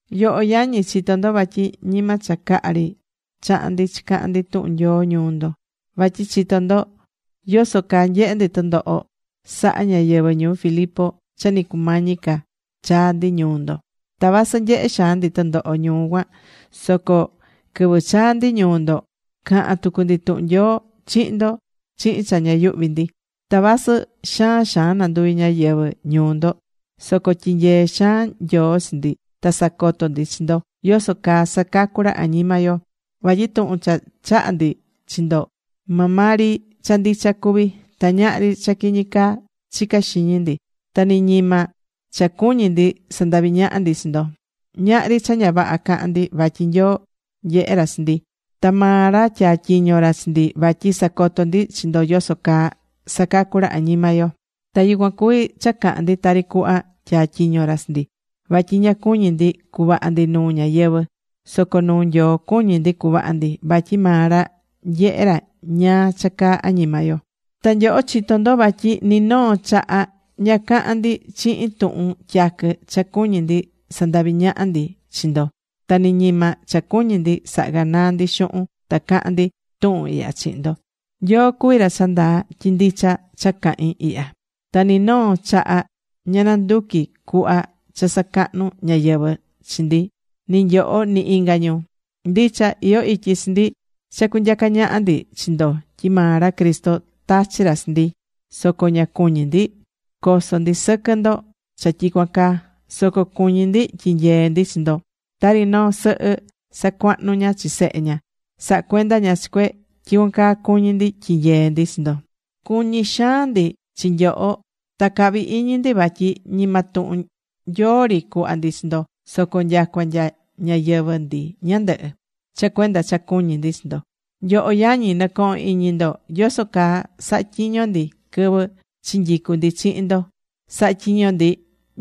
Nyoho yañi, chitó ndo vatyi ñima cha caha ri chaha̱n ndi chicahan ndi tuhun Nyoo ñuu ndo. Vatyi chitó ndo yoso caa nyehe̱ ndi tɨndoho saha̱ ñáyɨvɨ ñuu Filipo cha ni cumañi ca chaa̱ ndi ñuu ndo. Ta vasɨ nyehe̱ xaan ndi tɨndoho ñuu cuan soco quɨvɨ chaa̱ ndi ñuu ndo cahan tucu ndi tuhun Nyoo chihin ndo chihin cha ña yuhví ndi. Ta vasɨ xaan xaan nanduvi̱ ñáyɨvɨ ñuu ndo, soco tyinyee̱ xaan Nyoo chi ndi ta sacoto̱ ndi chi ndo yoso caa sacacú ra añima yo. Vatyi tuhun cha chaha̱ ndi chi ndo maa maa ri cha ndicha cuví. Ta ñahri cha quiñi caa chicá xiñi ndi. Ta ni ñima cha cuñí ndi sandavi ñaha ndi chi ndo. Ñahri cha ña vaha caha̱n ndi, vatyi Nyoo nyehé ra chi ndi, ta maa ra tyatyiño̱ ra chi ndi vatyi sacoto ndi chi ndo yoso caa sacacú ra añima yo. Ta yucuan cuví cha cahán ndi tari cuhva tyatyiño̱ ra chi ndi. Vatyi ña cuñí ndi cuvaha ndi nuu ñáyɨvɨ, soco nuu Nyoo cuñí ndi cuvaha ndi, vatyi maa ra nyehé ra ñáá cha caa añima yo. Ta nyoho chitó ndo vatyi ni noo chaha ña caha̱n ndi chihin tuhun tyaquɨ cha cuñí ndi sandavi ñaha ndi chi ndo. Ta ni ñima cha cuñi̱ ndi saha ganaa ndi xuhun ta caha̱n ndi tuhun ihya chihin ndo. Nyoo cuví ra cha ndaa tyi ndicha cha cahín ihya. Ta ni noo chaha ña nanducu̱ ndi cuhva cha sacahnu ñáyɨvɨ chi ndi, ni nyoho, ni inga ñu. Ndicha, iyó ityi chi ndi cha cunyacá ñaha ndi chi ndo tyi maa ra Cristo tachi̱ ra chi ndi, soco ña cuñí ndi coso ndi sɨquɨ ndo cha tyicuan caa. Soco cuñí ndi tyinyee ndi chi ndo. Tari noo sɨhɨ sacuahnú ña chi sehe ña, sahá cuenda ña chi cue, tyicuan caa cuñí ndi tyinyee ndi chi ndo. Cuñí xaan ndi chi nyoho, ta cahvi iñi ndi vatyi ñima tuhun Nyoo ri cuhva ndi chi ndo, soco nyacua nya ñayɨvɨ̱ ndi ñandɨhɨ, cha cuenda cha cuñí ndi chi ndo. Nyoho yañi, nɨcohón iñi ndo yoso caa saha̱ tyiño ndi quɨvɨ chinyicu̱ ndi chihin ndo. Sahá tyiño ndi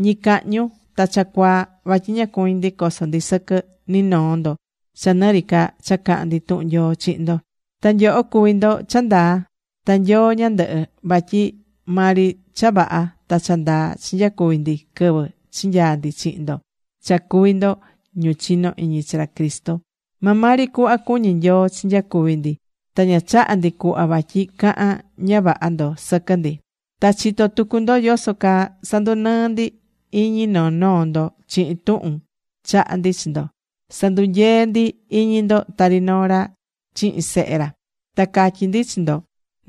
ñicahñu ta cha cuaa vatyi ña cuñí ndi coso ndi sɨquɨ ni noo ndo cha nɨ ri ca cha cahán ndi tuhun Nyoo chihin ndo. Ta nyoho cuví ndo cha ndaa, ta Nyoo ñandɨhɨ, vatyi maa ri cha vaha ta cha ndaa chinyacuvi̱ ndi quɨvɨ chinyaa̱ ndi chihin ndo cha cuví ndo ñu chinó iñi chi ra Cristo. Maa maa ri cuhva cuñí Nyoo chinyacuvi̱ ndi, ta ña chaha̱ ndi cuhva vatyi cahan ña vaha ndo sɨquɨ ndi. Ta chitó tucu ndo yoso caa sandunɨɨ́ ndi iñi noo noo ndo chihin tuhun chaha̱ ndi chi ndo. Sandunyee̱ ndi iñi ndo tari noo ra chihin sehe ra. Ta catyi̱ ndi chi ndo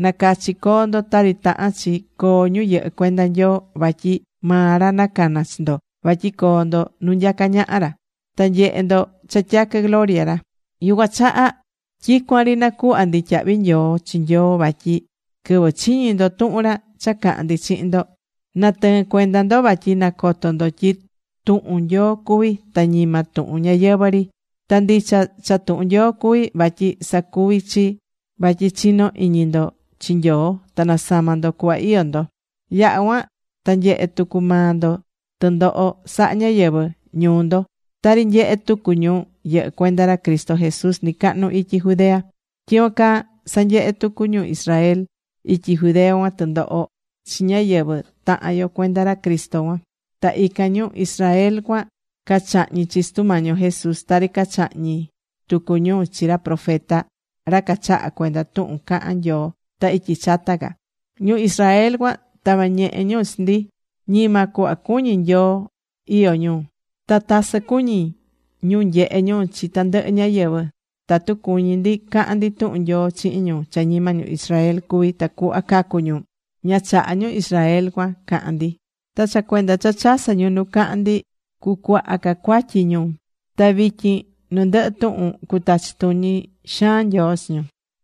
nacachi co̱o ndo tari tahán chi coo ñu yɨhɨ́ cuenda Nyoo. Vatyi maa ra nacana̱ chi ndo vatyi coo ndo nu nyacá ñaha ra, ta nyehe ndo cha tyaquɨ gloria ra. Yucuan chaha tyicuan ri nacuhvá ndi tyahvi nyoo chi Nyoo, vatyi quɨvɨ chiñi̱ ndo tuhun ra cha caha̱n ndi chihin ndo, natɨɨ̱n cuenda ndo vatyi nacoto̱ ndo tyi tuhun Nyoo cuví ta ñima tuhun ñáyɨvɨ ri. Ta ndicha cha tuhun Nyoo cuví, vatyi sacuvi̱ chi vatyi chino iñi ndo chi Nyoo ta nasama̱ ndo cuhva iyó ndo. Yaha̱ cuan ta nyehe̱ tucu maa ndo tɨndoho saha̱ ñáyɨvɨ ñuu ndo, tari nyehe̱ tucu ñu yɨhɨ́ cuenda ra Cristo Jesús nɨcahnu ityi Judea. Tyicuan caa sanyehe̱ tucu ñu Israel ityi Judea cuan tɨndoho chi ñáyɨvɨ tahan yo cuenda ra Cristo cuan. Ta ican ñu Israel cuan cachahñi̱ chi Sutu Mañi yo Jesús tari cachahñi̱ tucu ñu chi ra profeta, ra cachaha̱ cuenda tuhun cahán Nyoo ta ityi chata ca. Ñu Israel cuan tava̱ ñehe ñu chi ndi. Ñima cuhva cuñí Nyoo iyó ñu. Ta tasɨ cuñí ñu nyehe ñu chi tandɨhɨ ñáyɨvɨ. Tatu cuñí ndi cahan ndi tuhun Nyoo chihin ñu cha ñima ñu Israel cuví tacuhva cacu ñu, ña chahá ñu Israel cuan cahan ndi. Ta cha cuenda cha chasɨ́ ñu nu cahán ndi, cucuaha ca cuatyi ñu. Ta vityin nu ndɨhɨ tuhun cutachi tuñi xaan Nyoo chi ñu.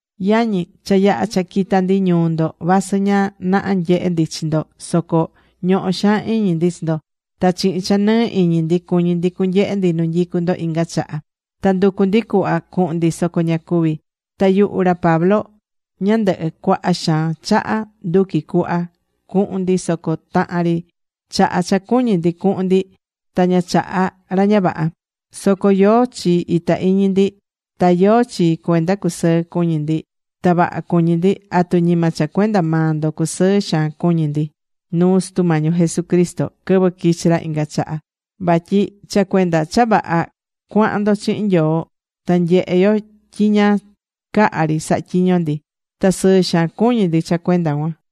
Yañi, cha yaha̱ cha quita̱ ndi ñuu ndo vasɨ ña naha nyehe̱ ndi chi ndo soco ñohó xaan iñi ndi chi ndo. Ta chihin cha nɨɨ iñi ndi cuñi̱ ndi cunyehe ndi nu nyicú ndo inga chaha. Ta nducu̱ ndi cuhva cuhun ndi soco ña cuvi̱. Ta yuhu ra Pablo ñandɨhɨ, cuaha xaan chaha nduqui̱ cuhva cuhun ndi, soco tahan ri chaha cha cuñi̱ ndi cuhun ndi ta ña chaha̱ ra ña vaha. Soco ¿yóó chi ita iñi ndi? Ta ¿yóó chi cuenda cusɨɨ cuñí ndi, ta vaha cuñí ndi? ¿Atu ñima cha cuenda maa ndo cusɨɨ xaan cuñí ndi nuu Sutu Mañi yo Jesucristo quɨvɨ quichi ra inga chaha? Vatyi cha cuenda cha vaha cuahan ndo chihin Nyoo ta nyehé yo tyi ña caha ri sahá tyiño ndi. Ta sɨɨ xaan cuñí ndi cha cuenda cuan.